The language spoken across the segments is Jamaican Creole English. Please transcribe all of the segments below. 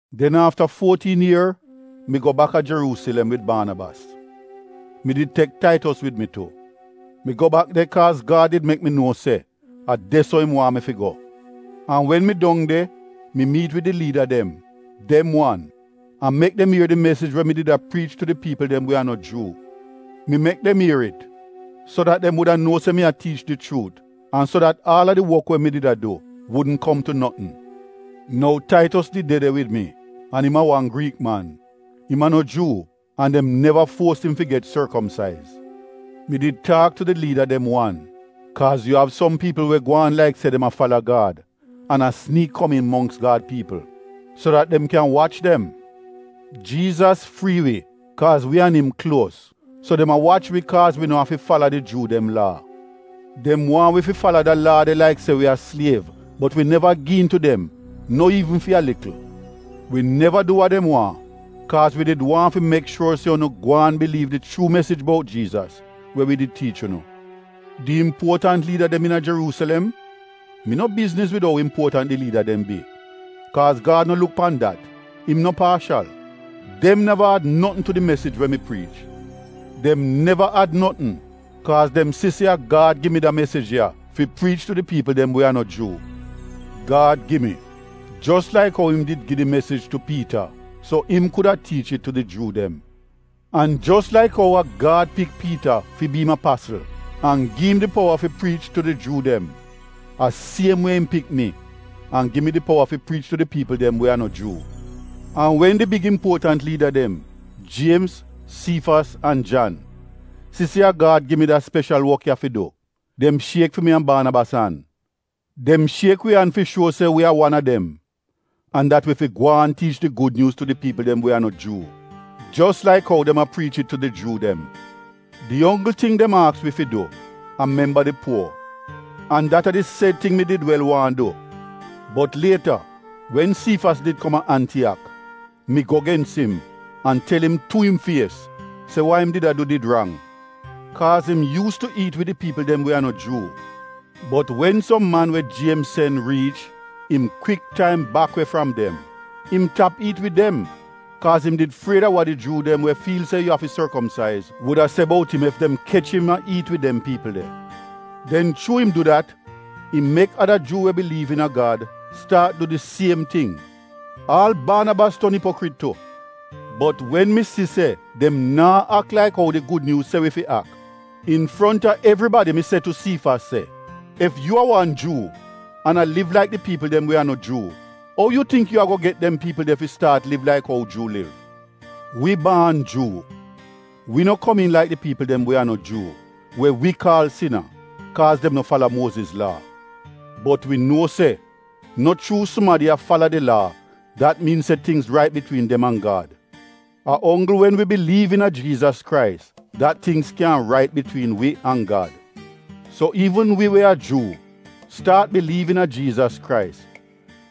Den afta fuotiin ier mi go baka a Jeruusilem wid Baanabas. Mi did tek Taitos wid mi tu. Mi go bak de kaaz Gad did mek mi nuo se a de-so im waahn mi fi go. An wen mi dong de mi miit wid di liida dem — dem wan, an mek dem ier di mesij we mi did a priich tu di piipl dem we a no Juu. Mi mek dem ier it so dat dem wuda nuo se mi a tiich di chuut an so dat aal a di wok we mi did a du, wudn kom tu notn. Nou Taitos did de de wid mi an im a wan Griik man — im a no Juu an dem neva fuos im fi get sorkomsaiz. Mi did taak tu di liida dem wan kaaz yu av som piipl we gwaan laik se dem a fala Gad an a siniik kom iin mongks Gad piipl, so dat dem kyan wach dem. Jiizas frii wi kaaz wi an im kluos. So dem a wach wi kaaz wi no afi fala di Juu dem Laa. Dem waahn wi fi fala da Laa de laik se wi a sliev. Bot wi neva gi iin tu dem — no iivn fi a likl. Wi neva du wa dem waahn kaaz wi did waahn fi mek shuor se unu gwaan biliiv di chuu mesij bout Jiizas we wi did tiich unu. Di impuotant liida dem iina Jeruusilem (mi no bizniz wid ou impuotant di liida dem bi, kaaz Gad no luk pan dat, im no paashal) — dem neva ad notn tu di mesij we mi priich. Dem neva ad notn kaaz dem si se a Gad gi mi da mesij ya fi priich tu di piipl dem we a no Juu. Gad gi mi jos laik ou im did gi di mesij tu Piita so im kuda tiich it tu di Juu dem. An jos laik ou a Gad pik Piita fi bi im apasl an gi im di powa fi priich tu di Juu dem, a siem wie im pik mi an gi mi di powa fi priich tu di piipl dem we a no Juu. An wen di big impuotant liida dem — Jiemz, Siifas an Jan, si se a Gad gi mi da speshal wok ya fi du, dem shiek fi mi an Baanabas an. Dem shiek wi an fi shuo se wi a wan a dem an dat wi fi gwaan tiich di Gud Nyuuz tu di piipl dem we a no Juu, jos laik ou dem a priich it tu di Juu dem. Di onggl ting dem aks wi fi du a memba di puo, an dat a di sed ting mi did wel waahn du. Bot lieta wen Siifas did kom a Antiyak mi go gens im an tel im tu im fies se wa im did a du did rang. Kaaz im yuus tu iit wid di piipl dem we a no Juu. Bot wen som man we Jiemz sen riich, im kwik taim bak we fram dem. Im tap iit wid dem kaaz im did fried a wa di Juu dem we fiil se yu afi sorkomsaiz wuda se bout im ef dem kech im a iit wid dem piipl de. Den chuu im du dat im mek ada Juu we biliiv iina Gad staat du di siem ting. Aal Baanabas ton ipokrit tu. Bot wen mi si se dem naa ak laik ou di Gud Nyuuz se wi fi ak, infronta evribadi mi se tu Siifas se, “Ef yu a wan Juu an a liv laik di piipl dem we a no Juu, ou yu tingk yu ago get dem piipl de fi staat liv laik ou Juu liv?” Wi baan Juu, wi no komiin laik di piipl dem we a no Juu we wi kaal sina kaaz dem no fala Muoziz Laa. Bot wi nuo se no chuu sumadi a fala di Laa dat miin se tingz rait bitwiin dem an Gad. A onggl wen wi biliiv iina Jiizas Krais dat tingz kyan rait bitwiin wi an Gad. So iivn wi we a Juu, staat biliiv iina Jiizas Krais.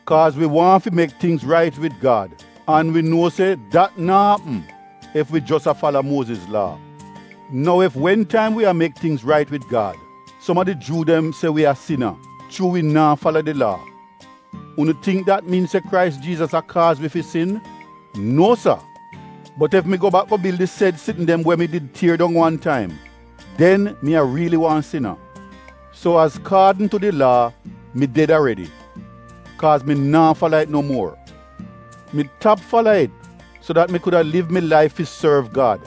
Kaaz wi waahn fi mek tingz rait wid Gad an wi nuo se dat naa apm ef wi jos a fala Muoziz Laa. Nou ef wen taim wi a mek tingz rait wid Gad, som a di Juu dem se wi a sina chuu wi naa fala di Laa — unu tingk dat miin se Krais Jiizas a kaaz wi fi sin? Nuo sa! Bot ef mi go bak go bil di sed sitn dem we mi did tier dong wan taim, den mi a riili wan sina. So azkaadn tu di Laa mi ded aredi — kaaz mi naa fala it no muor. Mi tap fala it so dat mi kuda liv mi laif fi sorv Gad.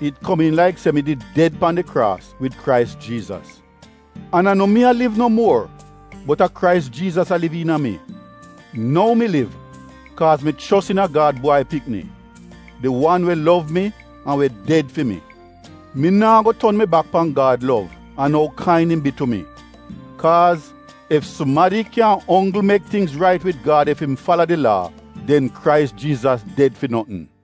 It komiin laik se mi did ded pan di kraas wid Krais Jiizas. An a no mi a liv no muor bot a Krais Jiizas a liv iina mi. Nou mi liv kaaz mi chos iina Gad Bwai Pikni — di wan we lov mi an we ded fi mi. Mi naa go ton mi bak pan Gad lov an ou kain im bi tu mi, kaaz ef sumadi kyan onggl mek tingz rait wid Gad ef im fala di Laa, den Krais Jiizas ded fi notn.